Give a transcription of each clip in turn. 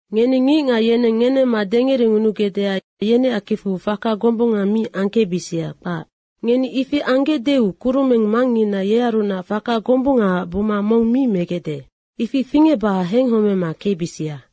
“Ngeni ngicngac yeneng ngenemma dengerengunugecdeac yeneac kicfu faka gombunga mi angkecbisia, kpac. Ngeni ifi anggecdeu kurumeng Mangngina yearunac faka gombunggaac buma mong mi megecde. Ifi fingecbacac henghomema kecbisia.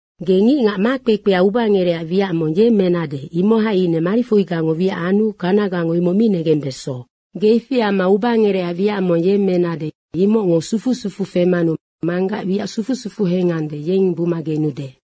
Ge ngicngac makpekpea ubangerecac wiac mong yemmenade, imohai ine marifoigango wiac anu kanagango imoc mi negembeso. Ge ifi amma ubangerecac wiac mong yemmenade, imocngo sufu sufuu femanu Manggac wiac sufu sufuu hengande, yennoc buma genude.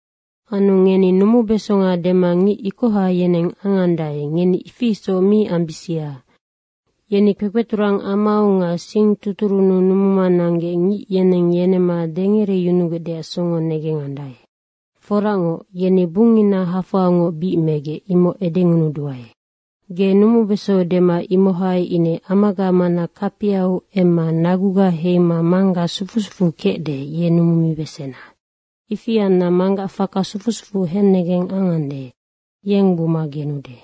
Anu ngeni numubesonga dema ngic ikoha yeneng angandae, ngeni ifi isoc mi ambisia. Yeni kpekpeturang amau nga singtuturunnu numuma nanggec ngic yeneng yenemma dengereyunugecdeac songo negengandae. Foracngoc, yeni bungngina hafoangoc bic megec, imoc edengunuduae. Ge numubesonga dema, imohai ine amaga mana kapiau emma naguga heima Manggac sufu sufuu kecde, ye numumibesena. Ifi anna Manggac faka sufu sufuu hennegeng angande, yeng buma genude.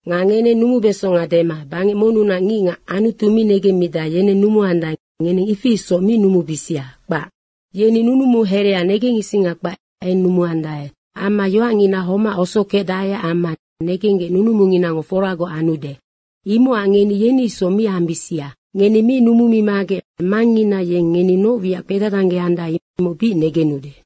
Nga ngeneng numubeso dema, bangec monnunac ngicngac Anutu mi negemmidae, yeneng numuandae, ngeneng ifi isoc mi numubisia, kpac. Yeni nunumu herea negengisinga kpac eng numuandae. Amma yoacngina homac osokecdaeac amma negenggec nunumunginango foragoc anude. Imocac ngeni yeni isoc mi ambisia. Ngeni mi numumimagec Mangngina yeng ngeni noc wiacac kpedadanggeandae, imoc bic negenude.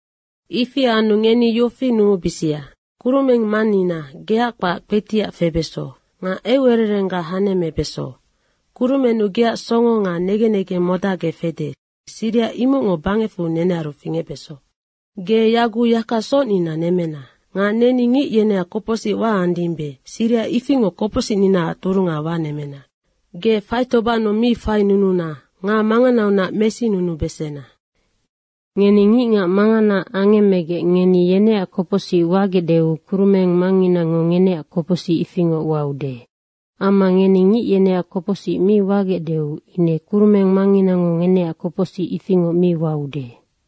Ifi anu ngeni yofi numubisia, ‘Kurumeng Mannina, geac kpac kpetiac febeso. Nga eucererengga hanemmebeso. Kurumennu geac songo nga negen negeng modacgec fede, siriha imocngoc bangecfu nenearu fingecbeso. Ge yaguc yaka socnina nemmena. Nga neni ngic yeneac kopocsic waandimbe, siriha ifingoc kopocsicninaac turunga wanemmena. Ge faitobannu mi fainununa nga manganaunac mesinunubesena.’ Ngeni ngicngac mangana angemmegec ngeni yeneac kopocsic wagecdeu kurumeng Mangnginango ngeneac kopocsic ifingoc waude. Amma ngeni ngic yeneac kopocsic mi wagecdeu ine Kurumeng Mangnginango ngeneac kopocsic ifingoc mi waude.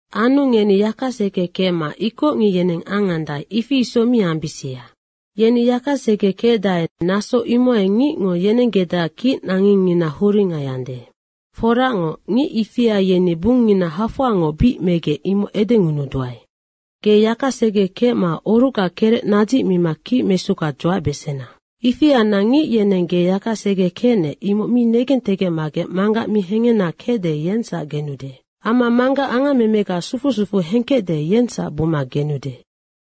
Anu ngeni yaka segekecma ikocngic yeneng angandae, ifi isoc mi ambisia. Yeni yakasege kecdae, naso imohai ngicngo yenenggecdeac kicnangengngina huringaiande. Foracngoc, ngic ifia yeni bungngina hafoangoc bic megec, imoc edengunuduae. Ge yakasege kecma orucga kerec nadzicmima kicmesuga dzuacbesena. Ifi anna ngic yeneng ge yakasege kecnec, imoc mi negentegecmagec Manggac mi hengena kecde, yengsac negenude. Amma Manggac angammemega sufu sufuu hengkecde, yengsac buma genude.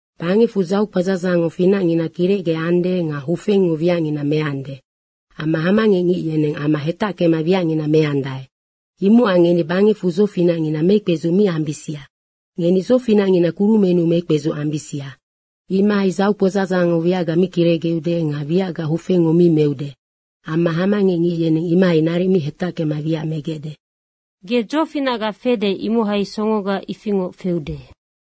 Bangecfu dzaukpadzadzangngo dzofinacngina kirecgeande nga hufengngo wiacngina meande amma hamangecngic yeneng ama hetackema wiacngina meandae. Imocac ngeni bangecfu dzofinacngina mekpedzuc mi ambisia. Ngeni dzofinacngina kurumennu mekpedzuc ambisia. Imohai dzaukpadzadzangngo wiacngina mi kirecgeude nga wiacngina hufengngo mi meude amma hamangecngic yeneng imohai naric mi hetackema wiac megecde. Ge dzofinacga fede, imohai songoga ifingoc feude.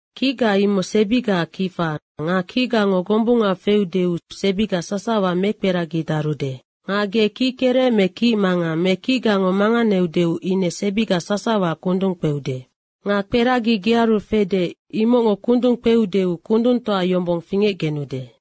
Kicga imoc sebigaac kifa nga kicgango gombunga feudeu sebiga sasawa mekperagidarude. Nga ge kickerec me kicmangang me kicgango manganeudeu ine sebiga sasawa kundung kpeude. Nga kperagi gearu fede, imocngo kundung kpeudeu kundungtoa yombong fingecgenude.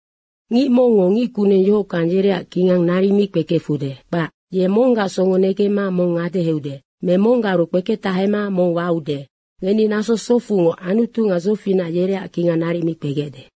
Ngic mongngo ngic kuneng yohockang yereac kingang naric mi kpekefude, kpac. Ye monggac songo negemma mong ngadeheude me monggaru kpeketahema mong waude. Ngeni naso socfungoc Anutu nga dzofinac yereac kingang naric mi kpegecde.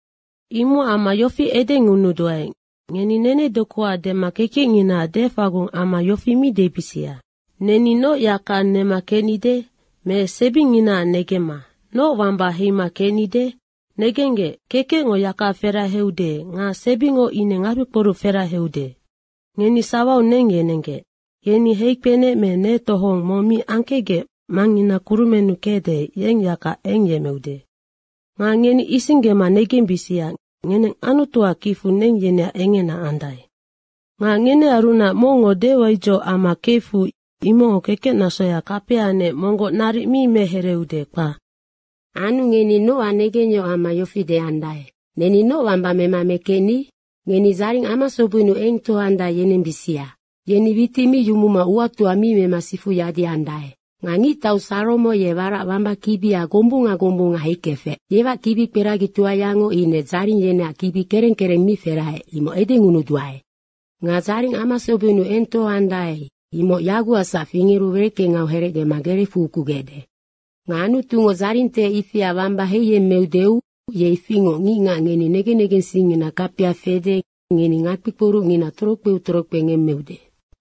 Imocac amma yofi edengunuduae, ngeni nenedokuac dema kekecnginaac defagung amma yofi mi debisia, ‘Neni noc yaka nema kecnide?’ me sebinginaac negemma, ‘Noc wamba heima kecnide?’ Negenggec, kekecngo yaka feraheude nga sebingo ine ngakpikporuc feraheude. Ngeni sawau neng yenenggec. Yeni heikpenec me netohong mong mi angkecgec Mangngina kurumennu kecde, yeng yaka eng yemmeude. Nga ngeni isinggema negembisia, ngeneng Anutuac kicfu neng yeneac engena andae. Nga ngenearunac mongngo dewaidzoc amma kefu imocngo kekecnasoya kapianec monggoc naric mi mehereeude, kpac. Anu ngeni nocac negengyohoc amma yofi deandae, ‘Neni noc wamba mema mekecni?’ Ngeni dzaring amasobennu eng tohoandae yenembisia. Yeni witic mi yumuma uatoa mi mema sifu yadiandae. Nga ngictau Saromo ye warac wamba kibia gombunga gombunga heikefec, yeac kibikperagitoayango ine dzaring yeneac kibi kereng kereng mi feraheec, imoc edengunuduae. Nga dzaring amasobennu eng tohoande, imoc yagucacsac fingeru wereckengau herecgema gerecfu ukugecde. Nga Anutungo dzaringtehec ifia wamba heiyemmeudeu ye ifingoc ngicngac ngeni negen negensingngina kapia fede, ngeni ngakpi kporucngina torokpeu torokpe ngemmeude.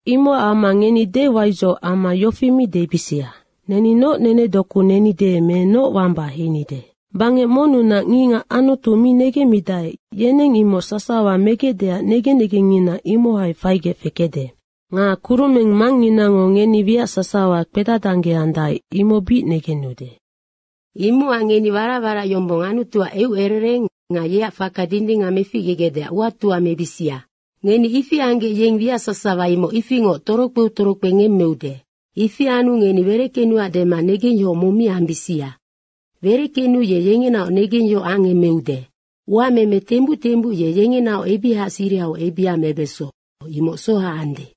Imocac amma ngeni dewaidzoc amma yofi mi debisia, ‘Neni noc nenedoku nenide me noc wamba heinide?’ Bangec monnunac ngicngac Anutu mi negemmidae, yeneng imoc sasawa megecdeac negen negengngina imohai faigec fekecde. Nga Kurumeng Mangnginango ngeni wiac sasawa kpedadanggeandae, imoc bic negenude. Imocac ngeni warac warac yombong Anutuac eucerereng nga yeac faka dindingac meficgegecdeac uatoa mebisia. Ngeni ifi anggec yeng wiac sasawa imocnoc ifingoc torokpeu torokpe ngemmeude. Ifi anu ngeni wereckenuac dema negengyohoc mong mi ambisia. Wereckenu ye yengenaoc negengyohoc angemeude. Uameme tembuc tembuc ye yengenaoc ebihaac sirihau ebiha mebeso, imoc soha ande.”